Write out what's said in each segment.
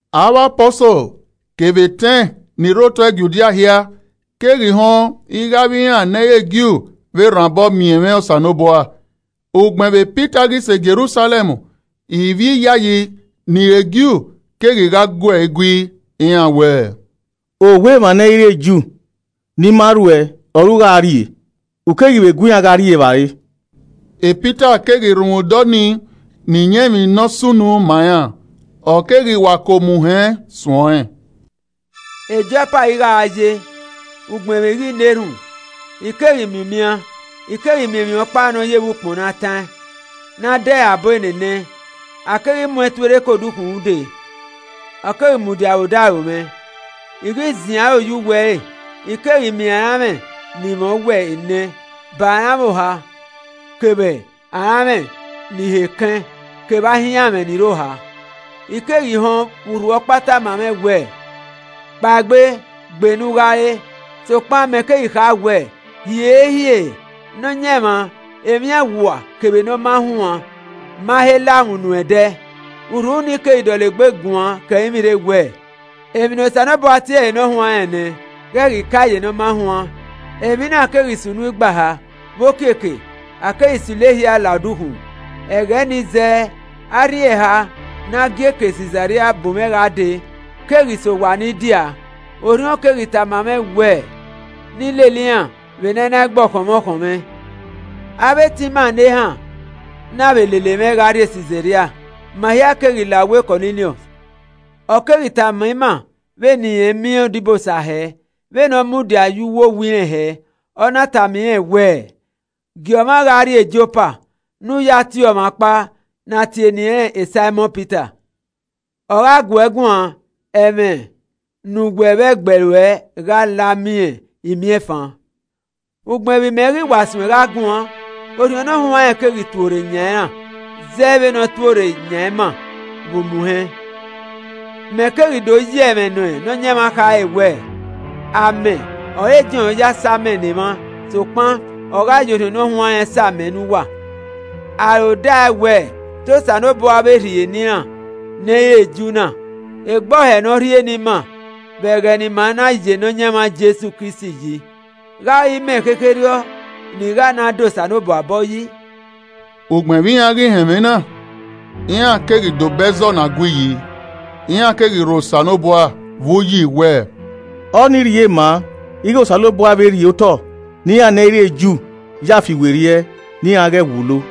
Avbe Apọsol kevbe etẹn ni rre otọ Judia hia keghi họn ighẹ avbe iran ne ẹ i re Ju vbe rhan obọ miẹn ẹmwẹ Osanobua. Ugbẹn vbe Pita ghi sẹ Jerusalẹm, ivbi iyayi ni re Ju keghi gha gu ẹe gui, iran wẹẹ, “Owa emwa ne ẹ i re Ju, ni ma rhuẹ ọre u gha rrie, u keghi vbe gu iran gha rri evbare.” Pita keghi rhunmwuda ọnii na iyẹn emwi ne ọ sunu ma iran, ọ keghi wa ke omuhẹn suẹn ọnrẹn: “Jopa ọre I gha ye, ugbẹn vbe I ghi na erhunmwu, I keghi miẹn umian. I keghi miẹn emwi ọkpa ne ọ ye vbe ukpọn ne a taẹn, ne a de ẹre abọ enenẹ, a keghi mu ẹn tuorre ke odukhunmwu dee, ọ keghi mudia vbe odaro mwẹ. I ghi ziẹn aro ye uwu ẹre I keghi miẹn aranmwẹ ni mwẹ owẹ enẹ, ba aranmwẹ oha kevbe aranmwẹ ni họ ekẹn kevbe ahianmwẹ ni rre oha. I keghi họn vbe urhu ọkpa tama mwẹ wẹ, ‘kpaegbe, gbe ne u gha re.’ Sokpan mẹ keghi kha wẹẹ, ‘Hiehiere, Nọyaẹnmwa emwi awua kevbe ne ọ ma huan ma he la mwẹ unu ẹdẹ.’ Urhu nii keghi dọlegbe guan ke ẹrinmwi rre wẹẹ, ‘Emwi ne Osanobua tie ẹre ne ọ huanrẹn nẹ, ghẹ ghi kae ye ne ọ ma huan.’ Emwi na keghi sunu igba ehe, vbe okiekie, a keghi silo ehia la odukhunmwu. Ẹghẹ nii zẹẹ arhin eha ne a gie ke Sisaria bu mwẹ gha dee keghi sẹ owa ne I dia a. Orhiọn keghi tama mwẹ wẹ ne I lele iran vbe ne a i na gbe ọkhọn mwẹ ẹ i khọn mwẹ. Avbe etẹn ima ne ehan na vbe lele mwẹ gha rrie Sisaria, ma hia keghi la owa Kọniliọs. Ọ keghi tama ima vbene irẹn miẹn odibosa hẹ, vbene ọ mudia ye uwu owa irẹn hẹ, ọ na tama irẹn wẹẹ, ‘Gie ọmwa gha rrie Jopa ne u ya tie ọmwa ọkpa ne a tie eni ẹnrẹn Saimọn Pita. Ọ gha gu uẹ guan ẹmwẹ ne uwẹ vbe ẹgbẹe ruẹ gha la miẹn imiẹnfan.’ Ugbẹn vbe imẹ ghi wa suẹn gha guan, Orhiọn Ne Ọ Huanrẹn keghi tuorre yan iran zẹ vbene ọ tuorre yan ima vbe omuhẹn. Mẹ keghi do ye ẹmwẹ ne Nọyaẹnmwa khare wẹ, ‘Amẹ ọre Jọn ya sa amẹ ne emwa sokpan ọ gha ye Orhiọn Ne Ọ Huanrẹn sa amẹ ne uwa’ Aro da ẹe wẹ te Osanobua vbe rhie ne iran ne ẹ i re Ju na, egbe ọhẹ ne ọ rhie ne ima vbe ẹghẹ ne ima na ya Nọyaẹnmwa Jesu Kristi yi, gha ọre imẹ khekherriọ ne I gha na da Osanobua obọ yi.” Ugbẹn vbe iran ghi họn ẹmwẹ na, iran keghi dobọ ẹzọ na gui yi, iran keghi rho Osanobua vbe uyi wẹẹ, “Ọnii rhie maa ighẹ Osanobua vbe rhie otọ ne iran ne ẹ i re Ju ya fiwerriẹ ne iran ghẹ wulo.”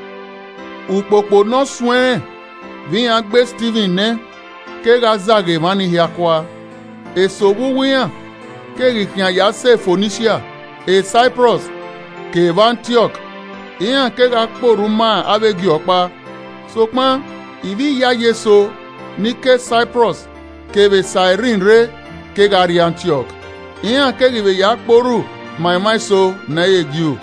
Ukpokpo ne ọ suẹn rẹn vbe iran gbe Stivin nẹ, kegha zagha emwa ni hia kua. Eso vbe uwu iran keghi khian ya sẹ Fonisia, Saiprọs kevbe Antiọk, iran kegha kpe orhu ma avbe Ju ọkpa. Sokpan ivbi iyayi eso ni ke Saiprọs kevbe Sairin rre kegha rrie Antiọk, iran keghi vbe ya kpe orhu ma emwa eso ne ẹ i re Ju,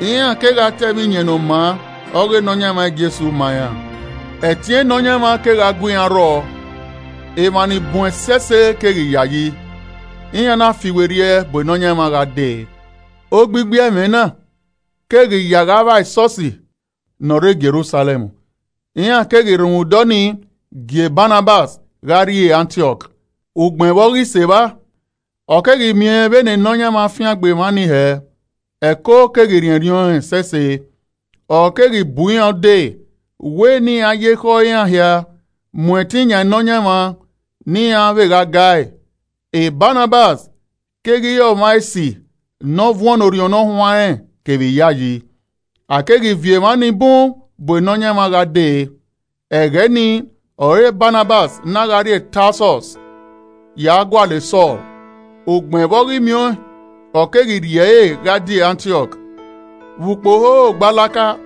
iran kegha ta ẹmwẹ Iyẹn Ne ọ maa ọghe Nọyaẹnmwa Jesu ma iran. Ẹtin Nọyaẹnmwa kegha gu iran rrọọ, emwa ni bun ẹsẹse keghi yayi, iran na fiwerriẹ bu Nọyaẹnmwa gha dee. Ogbigbi ẹmwẹ na keghi ya gha vba esọsi ne ọ rre Jerusalẹm. Iran keghi rhunmwuda ọnii gie Banabas gha rrie Antiọk. U gbẹn vbe ọ ghi sẹ evba, ọ keghi miẹn vbene Nọyaẹnmwa fiangbe emwa nii hẹ, ẹko keghi rhiẹnrhiẹn ọẹn ẹsẹse, ọ keghi bu iran ude wẹ ne iran ya ekhọe iran hia mu ẹtin yan Nọyaẹnmwa ne iran vbe gha ga ẹe. Banabas keghi re ọmwa esi ne ọ vuọn ne Orhiọn Ne Ọ Huanrẹn kevbe iyayi. A keghi viọ emwa ni bun bu Nọyaẹnmwa gha dee. Ẹghẹ nii ọre Banabas na gha rrie Tasọs ya gualọ Sọl. Ugbẹn vbe ọ ghi miẹn ọẹn, ọ keghi rhie ẹre gha die Antiọk. Vbe ukpo hoho gbalaka,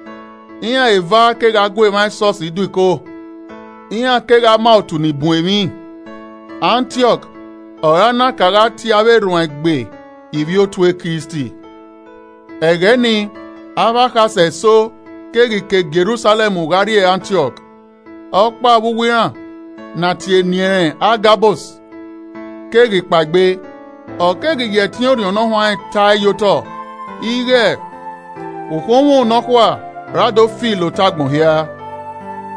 iran eva kegha gu emwa esọsi do iko, iran kegha ma otu ni bun emwi. Antiọk ọre a na ka gha tie avbe erhuanegbe ivbi Otu e Kristi. Ẹghẹ nii avbe akhasẹ eso keghi ke Jerusalẹm gha rrie Antiọk. Ọkpa vbe uwu iran, ne a tie eni ẹnrẹn Agabus keghi kpaegbe, ọ keghi ya ẹtin Orhiọn ta ẹe ye otọ ighẹ ukhunmwu nọkhua ra do fi la otọ agbọn hia.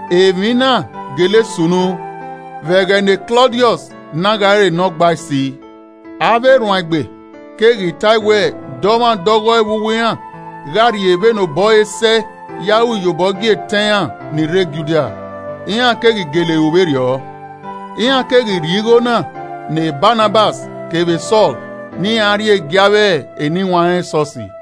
(Emwi na gele sunu vbe ẹghẹ ne Klọdiọs na gha re Nọgbaisi.) Avbe erhuanegbe keghi ta ẹe wẹ dọmwadẹ ọghọe vbe uwu iran gha rhie vbene obọ ẹre sẹe ya ru iyobọ gie etẹn iran ni rre Judia. Iran keghi gele ru vberriọ, iran keghi rhie igho na ne Banabas kevbe Sọl ne iran rhie gie avbe eniwanrẹn esọsi.